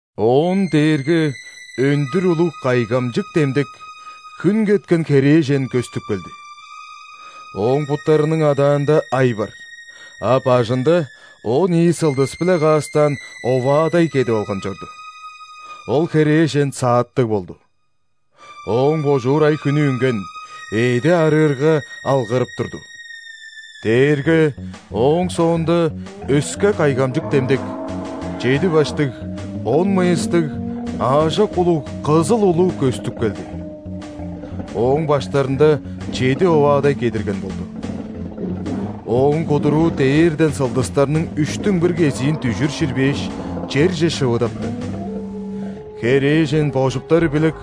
Оон дээрге өндүр улуг кайгамык демдек – хүн кеткен херээжен көстүп келди. Ооң буттарының адаанда ай бар, а бажында он ийи сылдыс-биле каастаан оваадай кедип алган чорду. Ол херээжен сааттыг болду. Ооң божуур ай-хүнү үнген, эъди аарыырга, алгырып турду. Дээрге ооң соонда өске кайгамчык демдек – чеди баштыг, он мыйыстыг аажок улуг кызыл улу көстүп келди. Ооң баштарында чеди оваадай кедирген болду. Ооң кудуруу дээрден сылдыстарның үштүң бир кезиин дүжүр ширбээш, черже шывадапты. Херээжен божуптары билек,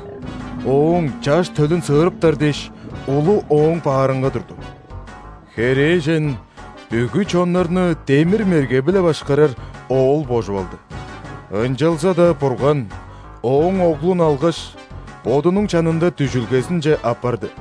ооң Чаш төлүн сыырыптар дээш, улу ооң баарынга турду. Херээжен бүгү чоннарны демир мерге-биле башкарар Оол божуп алды. Ынчалза-даа Бурган ооң Оглун алгаш, Бодунуң чанында дүжүлгезинче аппарды.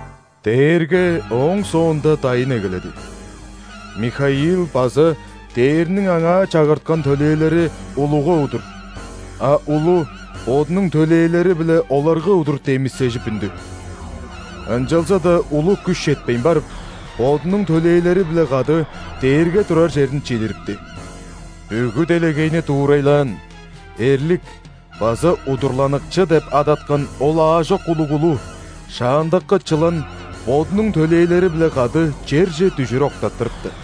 Дээрге ооң соонда дайын эгеледи: Михаил база дээрниң аңаа чагырткан төлээлери улуга удур, а улу бодунуң төлээлери-биле оларга удур демисежип үндү. Ынчалза-даа улу күш четпейн барып, бодунуң төлээлери-биле кады дээрге турар черин чидирипти. Бүгү делегейни дуурайлаан, эрлик база удурланыкчы деп адаткан ол аажок улуг улу, шаандагы чылан бодунуң төлээлери-биле кады черже дүжүр октаттырыпты.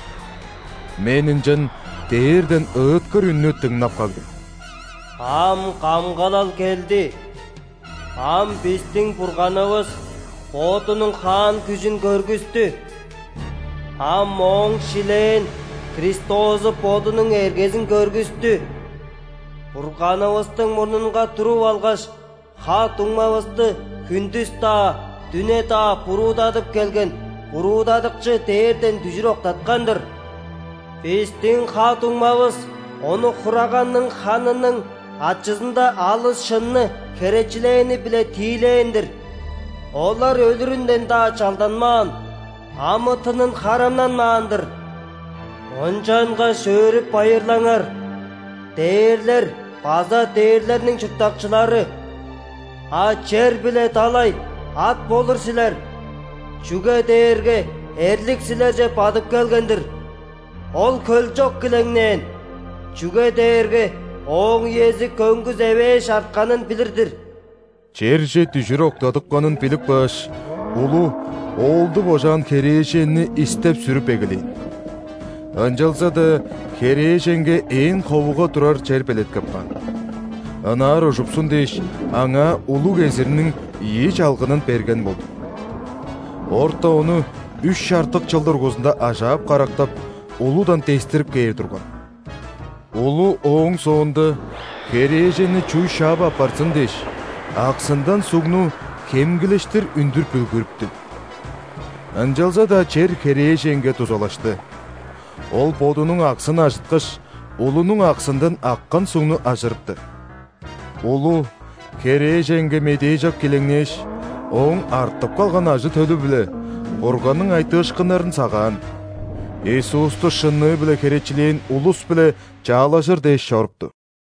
Мен ынчан дээрден ыыткыр үннү дыңнап кагдым: «Ам камгалал келди. Ам бистиң Бурганывыс Бодунуң хаан күжүн көргүстү! Ам Ооң шилээн Христозу Бодунуң эргезин көргүстү! Бурганывыстың мурнунга туруп алгаш, ха-дуңмавысты хүндүс-даа, дүне-даа буруудадып келген буруудадыкчы дээрден дүжүр октаткан-дыр. Бистиң ха-дуңмавыс ону Хураганның ханының ачызында алыс шынны херечилээни-биле тиил��эн-дир. Олар өлүрүнден-даа чалданмаан, амы-тынын харамнанмаан-дыр. Ынчангаш өөрүп-байырлаңар, дээрлер база дээрлерниң чурттакчылары! А чер биле далай, ат болур силер, чүге дээрге эрлик силерже бадып келген-дир! Ол хөлчок килеңнээн, чүге дээрге ооң үези көңгүс эвээш артканын билир-дир». Черже дүжүр октадыпканын билип кааш, улу Оолду божаан херээженни истеп-сүрүп эгелээн. Ынчалза-даа херээженге ээн ховуга турар чер белеткеп каан, ынаар ужупсун дээш, аңаа улуг эзирниң ийи чалгынын берген болду. Орта ону үш чартык чыл дургузунда ажаап-карактап, улудан дестирип кээр турган. Улу ооң соонда, херээженни чууй шаап аппарзын дээш, аксындан сугну хемгилештир үндүр бүлгүрүптү. Ынчалза-даа чер херээженге дузалашты: ол бодунуң аксын ажыткаш, улунуң аксындан аккан сугну ажырыпты. Улу херээженге медээжок килеңнээш, ооң артып калган ажы-төлү-биле – Бурганның айтыышкыннарын сагаан, Иисусту шынныы-биле херечилээн улус-биле чаалажыр дээш чорупту.